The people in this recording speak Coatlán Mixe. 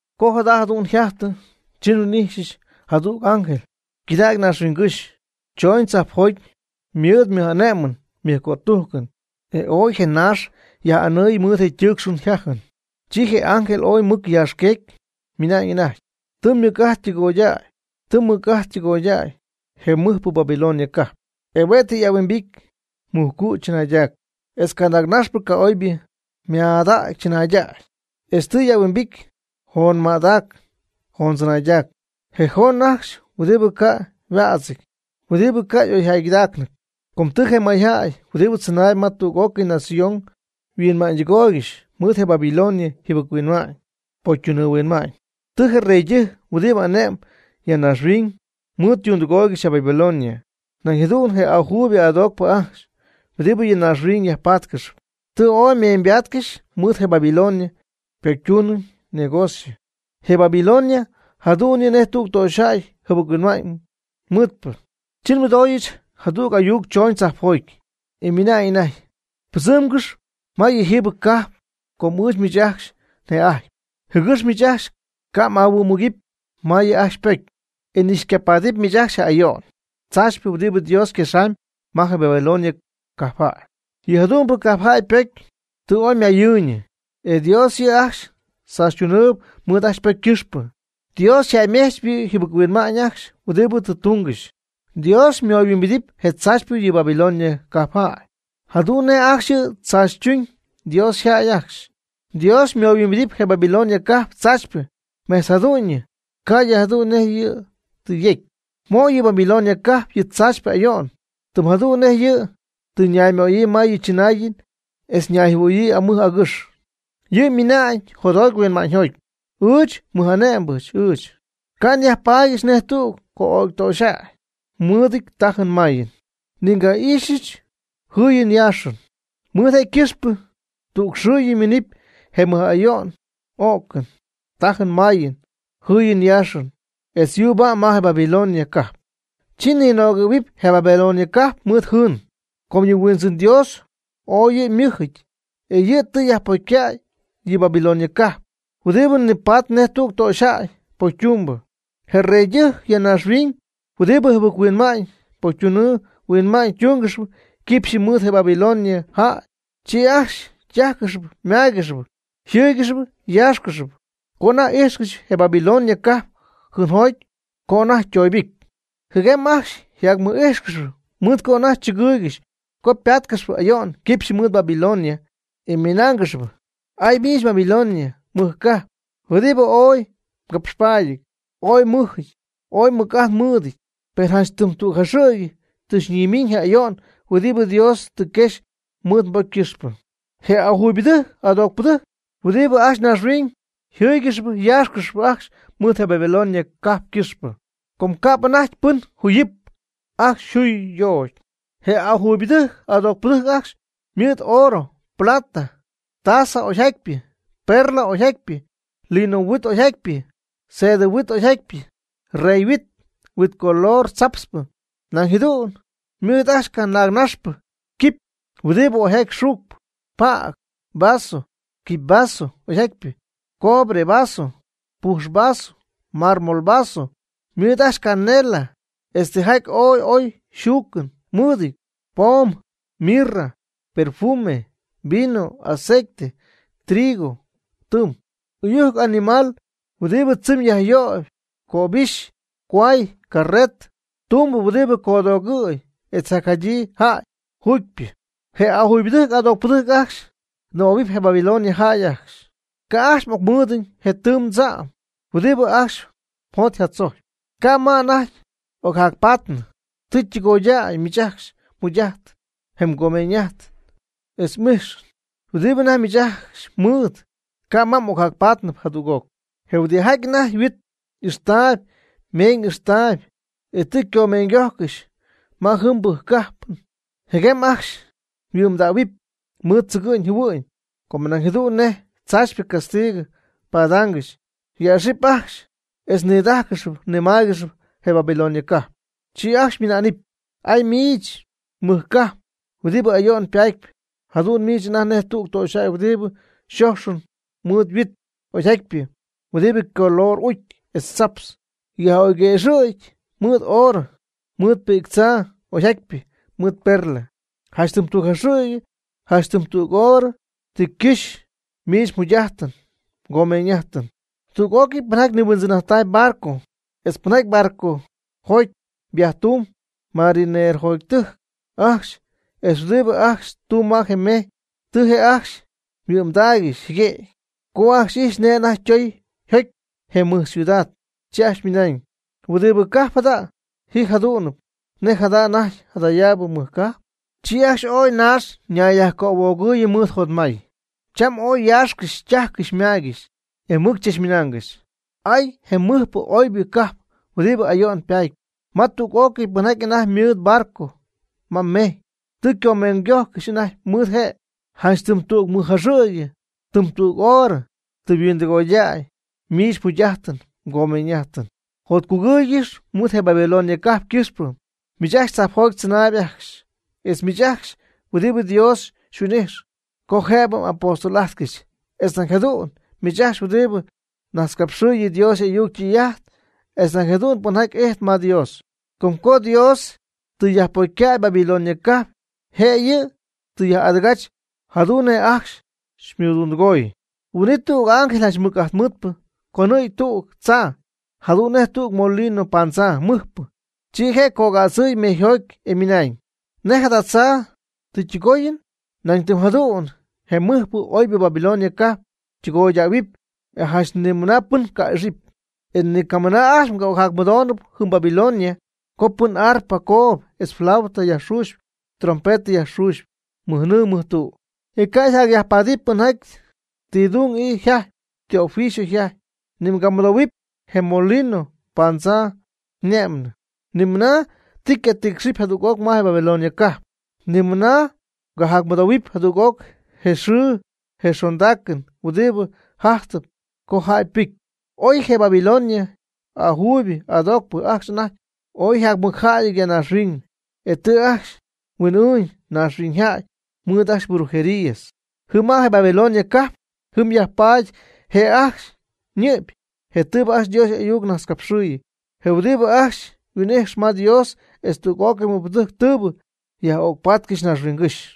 Co jada jadu'n yjajtɨ, chi nhuin'ijxyɨch jadüg ángel ycɨdägy naaxhuiñgɨ́xy, chooñ tzajpjoty mɨɨd ymɨj'ane'mɨn ymɨjcötujcɨn, e ooy je naax yaj'anɨɨy mɨɨd je ytɨɨcxɨn yjajɨn. Chi je ángel ooy mɨc yaaxqueecy ymɨna'ñ anajty: ―Tɨ ymɨc'ajt ytɨgooy, tɨ ymɨc' ajt ytɨgooy je mɨjpɨ Babilonia cajp, e hue' tɨ y'ahuimbity mujcu' chɨnaydac, etz canaagnaxpɨ ca'oybɨ ymaadac chɨnaydac, etz tɨ y'ahuimbity joonmaadac joondzɨnaaydac, je joon ajcxy huɨdibɨ ca' yhuädzɨty, huɨdibɨ ca' y'oyjäygɨdaacnɨty. Com tɨ je mayjäy huɨdibɨ tzɨnaayb ma tüg'ócɨy nación yhuinma'ñydɨgooygɨxy mɨɨd je Babilonia yjɨbɨc-huinma'ñ pocytunɨɨ huinma'ñ. Tɨ je reydɨjc huɨdibɨ ane'mb ya naaxhuiñ mɨɨd ytundɨgooygɨxy je Babilonia. Nañ jadu'n je ajuybɨ adoocpɨ ajcxy, huɨdibɨ ya naaxhuiñ yajpatcɨxy, tɨ oy ymeeñybatcɨxy mɨɨd je Babilonia pocytunɨɨ ñegocio. Je Babilonia jadu'n yɨ' nej tüg töxyjäy jɨbɨc-huinma'ñ mɨɨdpɨ. Chi nmɨdooyɨch jadüg ayuc chooñ tzajpjoty, e ymɨna'ñ anajty: ―Pɨdzɨmgɨx ma yɨjiibɨ cajp com ɨɨch miich ajcxy një'ajtpy, jɨgɨx miich ajcxy ca' m'aminmugɨpy ma yɨ' ajcxy ypocy, e ni xycapaadɨp miich ajcxy je ayo'n tzaachypɨ huɨdibɨ Dios yquexamyb ma je Babilonia cajpjäy. Yɨ jadu'mbɨ cajpjäy ypocy tɨ oy mayɨɨyñɨ e Dios yɨ' ajcxy tzachytunɨɨb mɨɨd ajcxy ypocy ycɨxpɨ. Dios yjäymejchp yɨ' yjɨbɨc-huinma'ñ ajcxy huɨdibɨ tɨ tungɨxy. Dios ymoyhuimbidɨpy je tzaachypɨ yɨ Babilonia cajpjäy, jadu'n nej ajcxy yɨ' je' tzaachytuñ Dios yjäy ajcxy, Dios ymoyhuimbidɨp je Babilonia cajp tzaachypɨ mejtz jadu'ñɨ ca'ydɨ jadu'n nej yɨ' tɨ yecy. Mo' yɨ Babilonia cajp yɨ tzaachpyɨ ayo'n, tɨm jadu'n nej yɨ' tɨ ñaymöyii ma yɨ chɨnaayɨn etz ñayjɨhuɨɨyɨ amɨj agɨx. Yɨ' ymɨna'ñ jotjoty huinma'ñyjoty: “Ɨɨch mɨj'ane'mbɨ ɨɨch. Ca' nyajpaadyɨch nej tüg co'ögytöxyjäy mɨɨdɨty tajɨn mayɨn. Ni nga'ixɨpyɨch jɨɨyɨn yaaxɨn.” Mɨɨd je' ycɨxpɨ tügxɨɨyɨ ymiinɨpy je mɨj'ayo'n o'cɨn, tajɨn mayɨn, jɨɨyɨn yaaxɨn etz yuuba'm ma je Babilonia cajp. Chi ninögɨ̈huɨpy je Babilonia cajp mɨɨd jɨɨn. Com yɨ Huindzɨn Dios ooy yɨ' ymɨjɨty, e yɨ' tɨ yajpocycäy yɨ Babilonia cajp, huɨdibɨ nipatp nej tüg töxyjäy pocytumbɨ. Je reydɨjc ya naaxhuiñ huɨdibɨ jɨbɨc-huinma'ñ pocytunɨɨ huinma'ñ tungɨxp quipxyɨ mɨɨd je Babilonia jäy, chi ajcxy ytájcɨxɨpy ymáygɨxɨpy yjɨ́ɨygɨxɨpy yáaxcɨxɨpy co anajty ijxcɨxyp je Babilonia cajp jɨɨnjoty co anajty ytooybɨcy. Jɨguem ajcxy yjacmɨj'íjxcɨxɨpy mɨɨd co anajty chɨgɨɨygɨxy co páatcɨxɨpy ayo'n quipxy mɨɨd Babilonia, e ymɨnáangɨxɨpy: ―¡Ay, miich Babilonia mɨj cajp, huɨdibɨ ooy mgapxpaadyɨty, ooy mmɨjɨty, ooy mmɨc'ajt mɨɨdɨty! Per janch tɨm tüg jaxɨ̈gy tɨ xyñimiiñ je' ayo'n huɨdibɨ Dios tɨ quexy mɨɨd mbocy ycɨxpɨ. Je ajuybɨdɨjc adoocpɨdɨjc huɨdibɨ ajcxy naaxhuiñ jɨ́ɨygɨxɨpy yáaxcɨxɨpy ajcxy mɨɨd je Babilonia cajp ycɨxpɨ, com ca'p anajty pɨn juuyɨp ajcxy yjuy ytoocy. Je ajuybɨdɨjc adoocpɨdɨjc ajcxy ymɨɨd oorɨ, plata, tzaa oyjatypɨ, perla oyjatypɨ, lino huit oyjatypɨ, sedɨ huit oyjatypɨ, rey yhuit, huit color tzaptzpɨ, nañ jadu'n ymɨɨd ajcxy canaagnaxpɨ quipy huɨdibɨ oyjaty xuucp, pajc vaso, quipy vaso oyjatypɨ, cobre vaso, pujx vaso, marmol vaso. Ymɨɨd ajcxy canela, etz tijaty ooy oy xuucɨn mɨɨdɨty, poom, mirra, perfume, vino aceite, trigo tɨɨm, ɨyujc animal huɨdibɨ tzɨmy yajyöyb, cöbixy, cohuay, carretɨ, tumbɨ huɨdibɨ codoogɨ̈yɨp, etz jacjadyii jäy juugypɨ. Je ajuybɨdɨjc adoocpɨdɨjc ajcxy ñɨmähuɨpy je Babilonia jäy ajcxy: ―¡Ca' ajcxy m'ocmɨɨdɨñ je tɨɨm tza'm huɨdibɨ ajcxy mjot yjatzojcpy, ca' ma anajty y'ocyajpatnɨ. Tɨ tɨgoydäy miich ajcxy mjugy'ajt, je mgomeeñ'ajt, etz m'ijxɨn huɨdibɨ anajty miich ajcxy mmɨɨd, ca' ma ocyajpatnɨp jadüg'oc! Je huidɨjaty anajty huit ixtaayb meeñ ixtaayb, e tɨ ycomeeñygojcɨxy ma yɨjɨmbɨ cajpɨn, jɨguem ajcxy yhuɨ'mdähuɨpy mɨɨd tzɨgɨ'ñ jɨhuɨ'ñ, co nañ jadu'n je tzaachypɨ castigɨ padaangɨxy. Yäxɨp ajcxy etz nidájcɨxɨpy nimáaygɨxɨpy je Babilonia cajp. Chi ajcxy ymɨnaanɨpy: ―¡Ay! ¡Miich mɨj cajp huɨdibɨ ayo'n patp! Jadu'n miich anajty nej tüg töxyjäy huɨdibɨ xoxyɨp mɨɨd huit oyjatypɨ, huɨdi ycolor ucy etz tzaptz, yaj'oyguëxɨ̈gy mɨɨd oorɨ, mɨɨd pi'ctzaa oyjatypɨ, mɨɨd perla. ¡Janch tɨm tüg jaxɨ̈gy, janch tɨm tüg horɨ, tɨ ycɨxy miich mmɨjjugy'ajtɨn mmɨjcomeeñ'ájtɨn! Tüg'ócɨy pɨnjaty nihuindzɨn'ajtp barco etz pɨnjaty barcojoty viajetumb, marinerotɨjc ajcxy etz huɨdibɨ ajcxy tumb ma je mejy, tɨ je' ajcxy yhuɨ'mdaaygɨxy jɨguëgy. Co ajcxy ijxy nej anajty ytoy yjocy je mɨj ciudad, chi ajcxy ymɨnañ: ―¿Huɨdibɨ cajp jada' ji jadu'nɨp nej jada anajty jadayaabɨ mɨj cajp? Chi ajcxy ooy naax ñayyajcöhuoogɨɨyɨ mɨɨd jotmay, cham ooy yaaxcɨxy, ytajcɨxy ymaygɨxy, e mɨc chachmɨnaangɨxy: ―¡Ay! ¡Je mɨjpɨ oybɨ cajp huɨdibɨ ayo'n patp, ma je tüg'ócɨy pɨnjaty anajty ymɨɨd barco ma mejy, tɨ ycomeeñygójcɨxy anajty mɨɨd je'! ¡Janch tɨm tüg mɨj jaxɨ̈gyɨ, tɨm tüg horɨ, tɨ yhuindɨgoydäy miich mmɨjjugy'ajtɨn mgomeeñ'ajtɨn! Jotcugɨɨygɨx mɨɨd je Babilonia cajp ycɨxpɨ, miich tzajpjoty tzɨnaayb ajcxy, etz miich ajcxy huɨdibɨ Dios xyhuin'ijx co jëbɨ m'apóstol'ajtcɨxy, etz nañ jadu'n miich ajcxy huɨdibɨ najtzcapxɨɨy Dios y'ayuc ytɨy'ajt, etz nañ jadu'n pɨnjaty ijtp ma Dios. Com co Dios tɨ yajpocycäy Babilonia cajp, je' yɨ' tɨ yaj'adɨgach jadu'n nej ajcxy xymɨɨddundɨgoy. Huin'it tüg ángel janch mɨc'ajtmɨɨdpɨ conɨ̈gy tüg tzaa, jadu'n nej tüg molino paandzaa mɨjpɨ, chi je' cogädzɨɨy mejyjoty, e ymɨnañ: ―Nej jada tzaa tɨ ytɨgooyɨn, nañ tɨm jadu'n je mɨjpɨ oybɨ Babilonia cajp ytɨgoydähuɨpy. E janch ni mɨna pɨn cajac'ixɨpy. E ni camɨna ajcxy mgajac'mɨdohuɨpy jɨm Babilonia co pɨn arpɨ coob etz flauta yajxuuxp trompetɨ yajxuuxp mɨjnɨɨ mɨjtu'. E ca' jacyajpaadɨp pɨnjaty ti dung ii jajtp, ti oficio jajtp, ni mgamɨdohuɨpy je molino paandzaa ñe'mɨn. Ni mɨna ti ycatɨɨcxɨpy jadüg'oc ma je Babilonia cajp. Ni mɨna ycayajmɨdohuɨpy jadüg'oc je xɨɨ je xondaacɨn huɨdibɨ jajtɨp co jäy ypɨcy. Oy je Babilonia ajuuybɨ y'adoocpɨ ajcxy anajty ooy yjamɨcjäyɨty ya naaxhuiñ, e tɨ ajcxy huin'ɨɨñ mayñaaxhuiñyjäy mɨɨd ajcxy brujerías. Jɨm ma je Babilonia cajp jɨm yajpaady je' ajcxy ñɨ'py je tɨɨbɨ ajcxy Dios y'ayuc najtzcapxɨɨyɨ, je huɨdibɨ ajcxy huin'ixyɨp ma Dios etz tüg'ócɨy mɨbɨjcpɨdɨjc tɨɨbɨ yaj'ögypaatcɨxy naaxhuiñygɨ́xy.